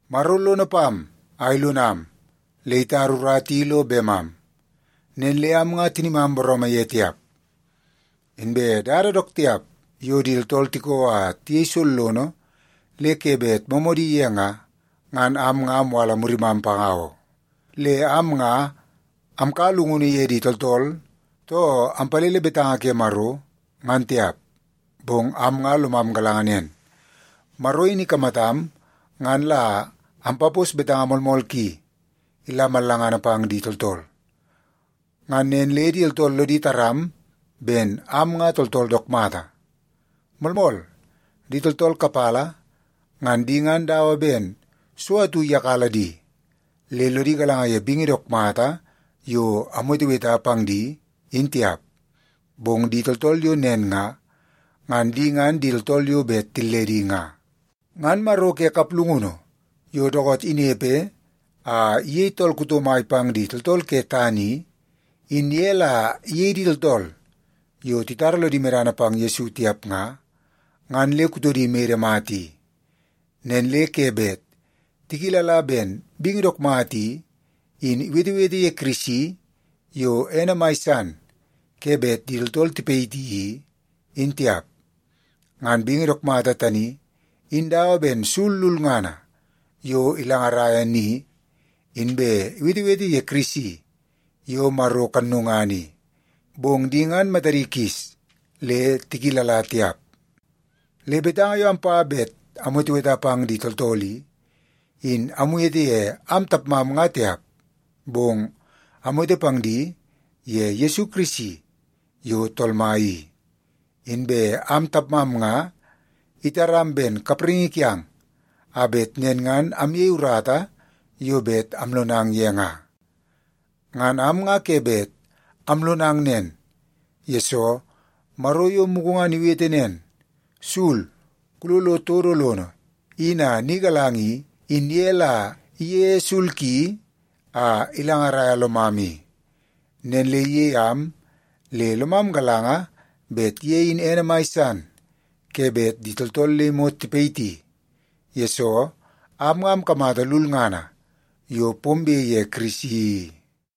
Maro lono pam a ilonam le itara urata i lo bemam, nen le am nga tinimam booroomoo ye tiap. Inbe dada dook tiap yo di tooltool tiko a tiyei sollono le ke bet moomoodi ye nga, ngan am nga amwala murimam panga oo. Le am nga amkaua llungunu ye di tooltool, too ampalele betanga ke Maro, ngan tiap, bong am nga lomam galanga nen, Maro in ikamatam ngan la ampapos betanga moolmool ki ila mallangana pang di tooltool. Ngan nen le di tooltool lodi taram ben am nga tooltool dook mata. Moolmool, di tooltool kapala, ngan di ngan dawa ben so atu iyakala di, le lodi galanga ye bingi dook mata yo amweteweta pang di, in tiap. Bong di tooltool yo nen nga, ngan di ngan di tooltool yo bet tilledi nga. Ngan maro ke kaplungunu yo dookoot inepe a iyei tool kuto mai pang di tooltool ke tana i, in ye la iyei di tooltool yo titara lodi medana pang Yesu tiap nga, ngan le kutodi mede mata i. Nen le ke bet tikilala ben bingi dook mata i, in iwetewete ye Kirisi yo ene mai san ke bet di tooltool tipayiti i, in tiap. Ngan bingi dook mata tani, in dawa ben sul lulngana yo ilangaraia ni, inbe iwetewete ye Kirisi yo Maro kannungana i, bong di ngan matadi kis le tikilala tiap. Le betanga yo ampa bet amweteweta pang di tooltool i, in amwete ye am tapmam nga tiap, bong amwete pang di ye Yesu Kirisi yo Tool Mai i. Inbe am tapmam nga itaram ben kapraingi kiang a bet nen ngan amyei urata yo bet amlonang ye nga. Ngan am nga ke bet amlonang nen, yesoo Maro yo mugu ngan iwete nen, “Sul, kulolo todo lono in a ni galanga” i, in ye la iyeie sul ki a ilangaraia lomam i. Nen le iyei am le lomam galanga bet ye in ene mai san ke bet di tooltool le imot tipayiti, yesoo am nga amkamata lulngana yo pombe ye Kirisi i.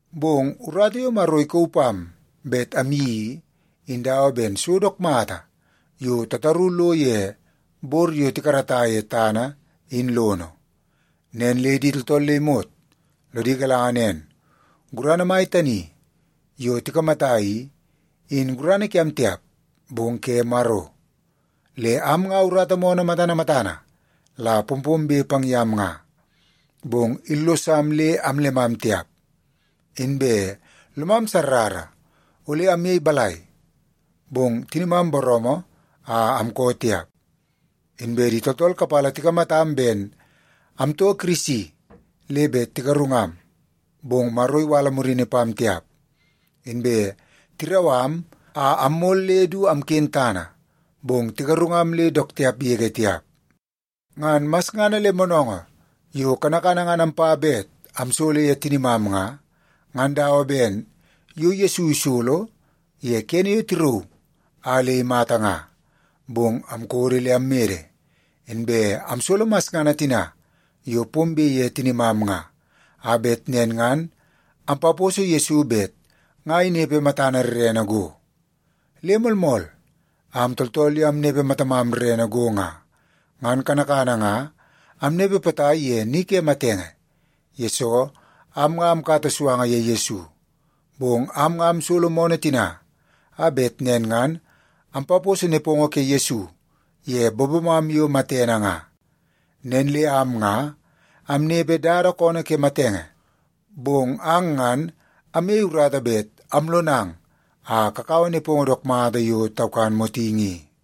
Bong urata yo Maro ikauu pam bet amyeii i, in dawa ben so dook mata yo tataru lo ye bor yo tikarata ye tana in lono. Nen le di tooltool le imot lodi galanga nen, gurana mai tani yo tikamata i, in gurana kiam tiap, bong ke Maro. Le am nga urata moonoo matana matana la pompombe pang yam nga, bong illosam le amllemam tiap. Inbe lomam sarrara ole amyei balai, bong tinimam booroomoo a amkoo tiap. Inbe di tooltool kapala tikamatam ben amtoo Kirisi le bet tigarungam, bong Maro iwala murini pam tiap. Inbe tirau am a ammol le du amken tana, bong tigarungam le dook tiap yege tiap. Ngan masngana le moonoongoo yo kanakana ngan ampa bet amsolo ye tinimam nga, ngan dawa ben yo Yesu isolo ye kene yo tirauu a le imata nga. Bong amkodo le ammede, inbe amsolo masngana tina yo pombe ye tinimam nga, a bet nen ngan ampaposo Yesu bet nga inepe matana rrene go. Le moolmool, am tooltool yo amnepe matamam rrene go nga, ngan kanakana nga amnepe potai ye ni ke matenge, yesoo am nga amkata suanga ye Yesu. Bong am nga amsolo moonoo tina, a bet nen ngan ampaposo nepongo ke Yesu ye bobomam yo matene nga. Nen le am nga amnepe dada koonoo ke matenge, bong ang ngan amyei urata bet amlonang a kakaua nepongo dook mata yo taukan motingi i.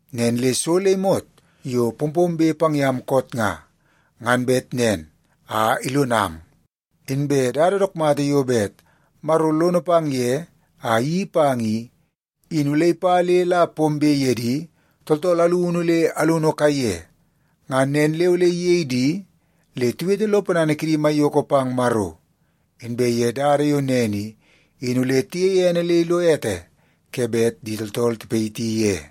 Nen le so le imot yo pompombe pang yam koot nga, ngan bet nen a ilonang. Inbe dada dook mata yo bet Maro lono pang ye a iyeii pang i, in ole ipa le la pombe ye di tooltool alunu le alunu kaiye. Ngan nen le ole iyei di le tiwete lo ponana kidi maiyoko pang Maro, inbe ye dada yo nen i, in ole tiyeie ene le ilo ete ke bet di tooltool tipayiti ye.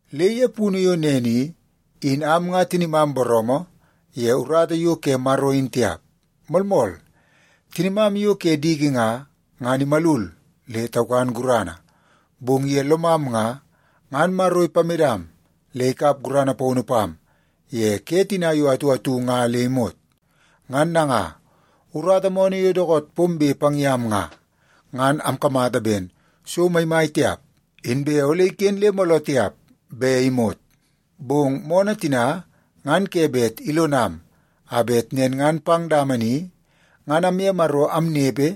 Le ye punu yo nen i, in am nga tinimam booroomoo ye urata yo ke Maro in tiap. Moolmool, tinimam yo ke diki nga, ngan imalul le taukan gurana, bong ye lomam nga, ngan Maro ipamedam le ikap gurana paunu pam ye ke tina yo atu atu nga le imot. Ngan nanga, urata moonoo yo dookoot pombe pang yam nga, ngan amkamata ben so maimai tiap, inbe ole iken le mooloo tiap be imot. Bong moonoo tina ngan ke bet ilonam, a bet nen ngan pang dama ni ngan amye Maro amnepe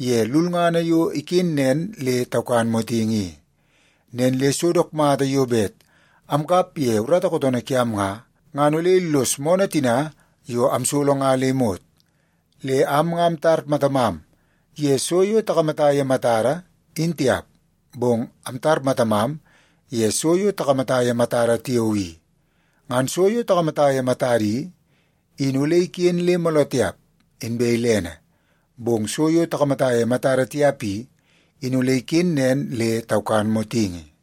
ye lulngana yo iken nen le taukan motingi i. Nen le so dook mata yo bet amkap ye urata kootoonoo kiam nga, ngan ole illos moonoo tina yo amsolo nga le imot. Le am nga amtar matamam ye so yo takamata ye matada, in tiap, bong amtar matamam ye so yo takamata ye matada tiao i. Ngan so yo takamata ye matada i, in ole iken le mooloo tiap, inbe ilene, bong so yo takamata ye matada tiap i, in ole ikenen nen le taukan motingi.